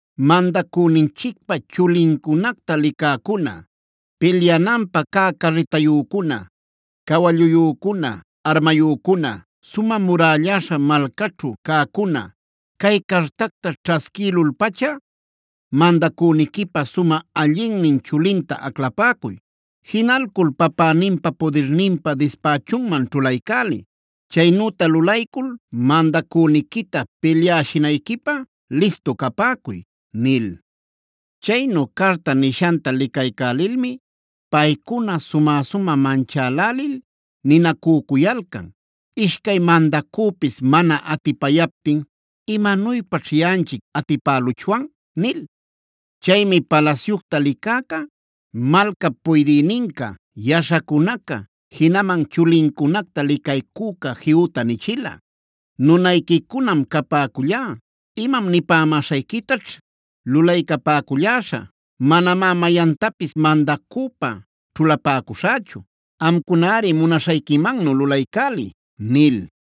“Mandacüninchicpa chulincunacta licäcuna, pilyananpä cä carritayücuna, cawalluyücuna, armayücuna, sumä murälläśha malcaćhu cäcuna, cay cartacta ćhasquïlul-pacha, mandacüniquipä sumä allinnin chulinta aclapäcuy. Jinalcul papäninpa pudirninpä dispächunman ćhulaycäliy. Chaynüta lulaycul mandacüniquita pilyäshinayquipä listu capäcuy” nil. Chaynu carta nishanta licaycälilmi paycuna sumä-sumä manchälälil ninacücuyalcan: “Ishcay mandacüpis mana atipayaptin ¿imanuypaćh yaꞌanchic atipäluchwan?” nil. Chaymi palasyucta licäca, malcap puydïninca, yaśhacunaca, jinaman chulincunacta licaycüca Jehuta nichila: “Nunayquicunam capäcullá; imam nipämäśhayquitaćh lulaycapäculläśhä. Manamá mayantapis mandacüpä ćhulapäcuśhächu. Amcunari munaśhayquimannu lulaycäliy” nil.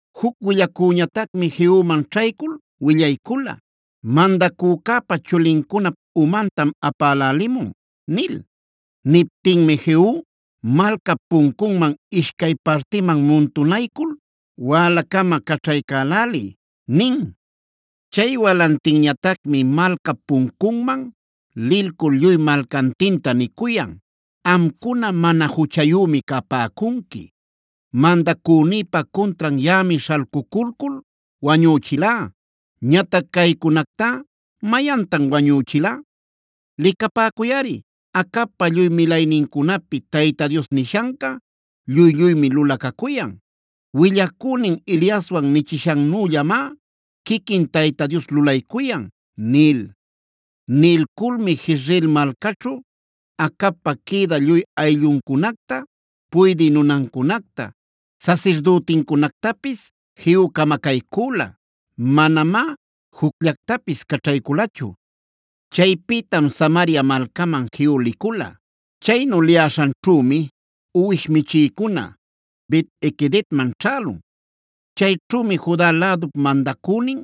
Juc willacüñatacmi Jehuman ćhaycul willaycula: “Mandacücäpa chulincunap umantam apälälimun” nil. Niptinmi Jehu: “Malcap puncunman ishcay partiman muntunaycul wälacama caćhaycäläliy” nin. Chay walantinñatacmi malcap puncunman lilcul lluy malcantinta nicuyan: “Amcuna mana juchayümi capäcunqui. Mandacünïpa cuntran yaꞌami śhalcuculcul wañüchilá. Ñatac caycunactá ¿mayantan wañüchila? Licapäcuyꞌari, Acabpa lluy milaynincunapi Tayta Dios nishanca lluy-lluymi lulacacuyan. Willacünin Eliaswan nichishannüllamá quiquin Tayta Dios lulaycuyan” nil. Nilculmi Jezreela malcaćhu Acabpa quïdä lluy aylluncunacta, puydï nunancunacta, sasirdütincunactapis Jehu camacaycüla. Manamá jucllactapis caćhayculachu. Chaypïtam Samaria malcaman Jehu licula. Chaynu liyäśhanćhümi uwish michïcuna Bet-equedman ćhälun. Chayćhümi Juda lädup mandacünin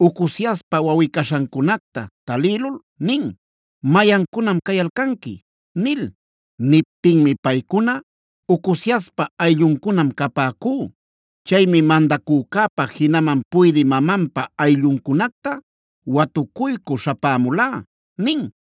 Ocoziaspa wawꞌi-caśhancunacta talïlul nin: “¿Mayancunam cayalcanqui?” nil. Niptinmi paycuna: “Ocoziaspa aylluncunam capäcú. Chaymi mandacücäpa jinaman puydï mamanpa aylluncunacta watucuycü śhapämulá” nin.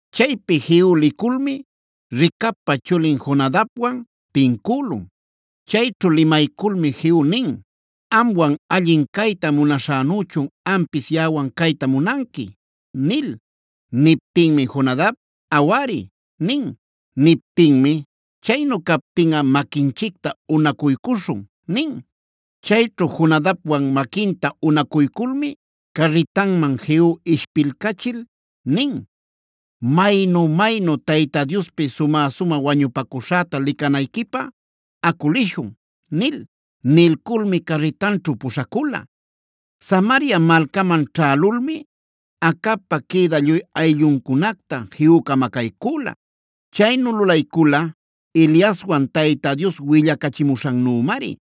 Chaypi Jehu liculmi Recabpa chulin Jonadabwan tincülun. Chayćhu limayculmi Jehu nin: “¿Amwan allin cayta munaśhänüchun ampis yaꞌawan cayta munanqui?” nil. Niptinmi Jonadab: “Awari” nin. Niptinmi: “Chaynu captinꞌa maquinchicta unacuycuśhun” nin. Chayćhu Jonadabwan maquinta unacuyculmi carritanman Jehu ishpilcachil nin: “Maynu-maynu Tayta Diospi sumä-sumä wañupacuśhäta licanayquipä acu lishun” nil. Nilculmi carritanćhu puśhacula. Samaria malcaman ćhälulmi Acabpa quïdä lluy aylluncunacta Jehu camacaycüla. Chaynu lulaycula Eliaswan Tayta Dios willacachimuśhannümari.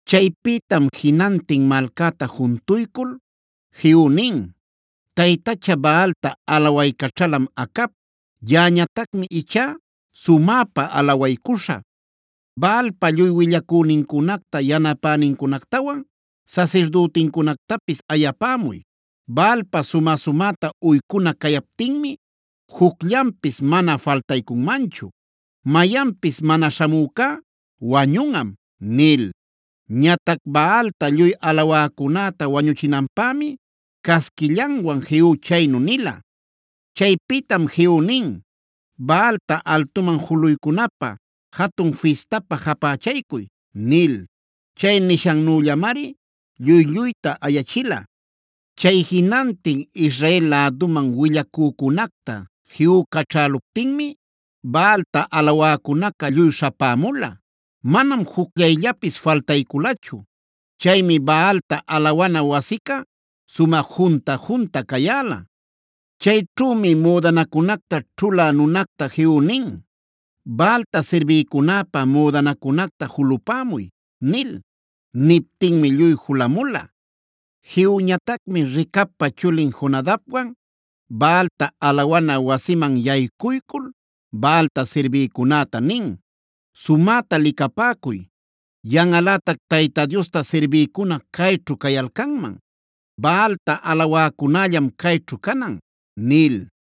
Chaypïtam jinantin malcäta juntuycul Jehu nin: “Taytacha Baalta alawaycaćhalam Acab. Yaꞌañatacmi ichá sumäpa alawaycuśhä. Baalpa lluy willacünincunacta, yanapänincunactawan, sasirdütincunactapis ayapämuy. Baalpä sumä-sumäta uycuna cayaptinmi jucllanpis mana faltaycunmanchu. Mayanpis mana śhamücá wañunꞌam” nil. Ñatac Baalta lluy alawäcunäta wañuchinanpämi casquillanwan Jehu chaynu nila. Chaypïtam Jehu nin: “Baalta altuman juluycunapä jatun fistapä japächaycuy” nil. Chay nishannüllamari lluy-lluyta ayachila. Chay jinantin Israel läduman willacücunacta Jehu caćhäluptinmi Baalta alawäcunaca lluy śhapämula. Manam jucllayllapis faltayculachu. Chaymi Baalta alawana wasica sumä junta-junta cayäla. Chayćhümi müdanacunacta ćhulä nunacta Jehu nin: “Baalta sirbïcunäpä müdanacunacta julapämuy” nil. Niptinmi lluy julamula. Jehuñatacmi Recabpa chulin Jonadabwan Baalta alawana wasiman yaycuycul Baalta sirbïcunäta nin: “Sumäta licapäcuy, yanꞌalätac Tayta Diosta sirbïcuna cayćhu cayalcanman. Baalta alawäcunällam cayćhu canan” nil.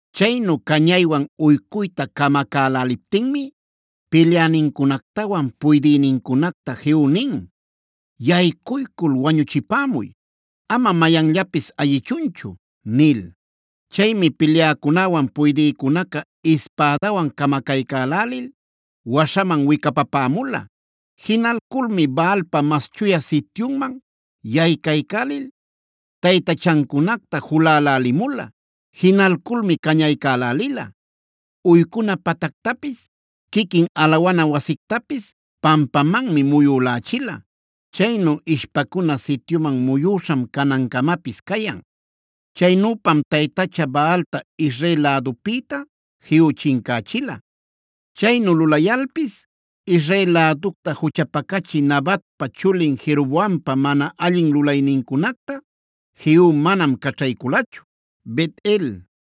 Chaynu cañaywan uycuyta camacäläliptinmi pilyänincunactawan puydïnincunacta Jehu nin: “Yaycuycul wañuchipämuy. Ama mayanllapis ayichunchu” nil. Chaymi pilyäcunäwan puydïcunaca ispädawan camacaycälälil waśhaman wicapapämula. Jinalculmi Baalpa mas chuya sityunman yaycaycälil, taytachancunacta julälälimula. Jinalculmi cañaycälälila. Uycuna patactapis, quiquin alawana wasictapis pampamanmi muyülächila. Chaynu ishpacuna sityuman muyüśham canancamapis cayan. Chaynüpam taytacha Baalta Israel lädupïta Jehu chincächila. Chaynu lulayalpis Israel läducta juchapacachï Nabatpa chulin Jeroboampa mana allin lulaynincunacta Jehu manam caćhayculachu. Bet-el,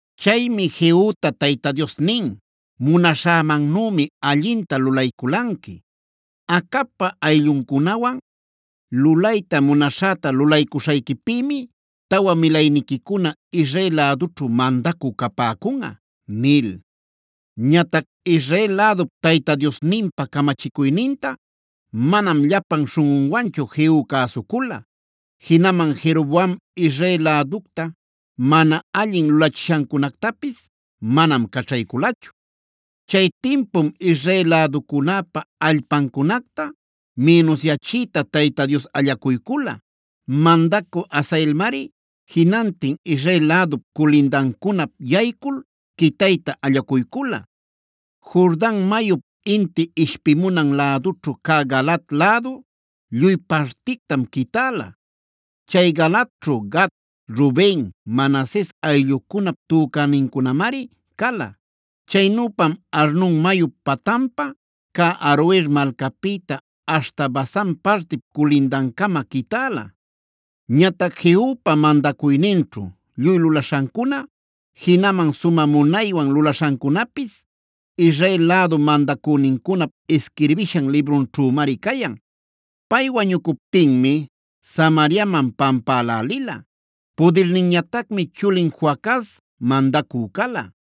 Chaymi Jehuta Tayta Dios nin: “Munaśhämannümi allinta lulayculanqui. Acabpa aylluncunawan lulayta munaśhäta lulaycuśhayquipïmi tawa milayniquicama Israel lädućhu mandacü capäcunꞌa” nil. Ñatac Israel lädup Tayta Diosninpa camachicuyninta manam llapan śhunꞌunwanchu Jehu cäsucula. Jinaman Jeroboam Israel läducta mana allin lulachishancunactapis manam caćhayculachu. Chay timpum Israel läducunäpa allpancunacta mïnusyachiyta Tayta Dios allacuycula. Mandacü Hazaelmari jinantin Israel lädup culindancunap yaycul quitayta allacuycula. Jordan mayup inti ishpimunan lädućhu cä Galaad lädu lluy partictam quitäla. Chay Galaadćhu Gad, Ruben, Manases ayllucunap tücänincunamari cala. Chaynüpam Arnon mayup patanpa cä Aroer malcapïta aśhta Basan partip culindancama quitäla. Ñatac Jehupa mandacuyninćhu lluy lulaśhancuna, jinaman sumä munaywan lulaśhancunapis Israel lädu mandacünincunap isquirbishan librunćhümari cayan. Pay wañucuptinmi Samariaman pampälälila. Pudirninñatacmi chulin Joacaz mandacü cala.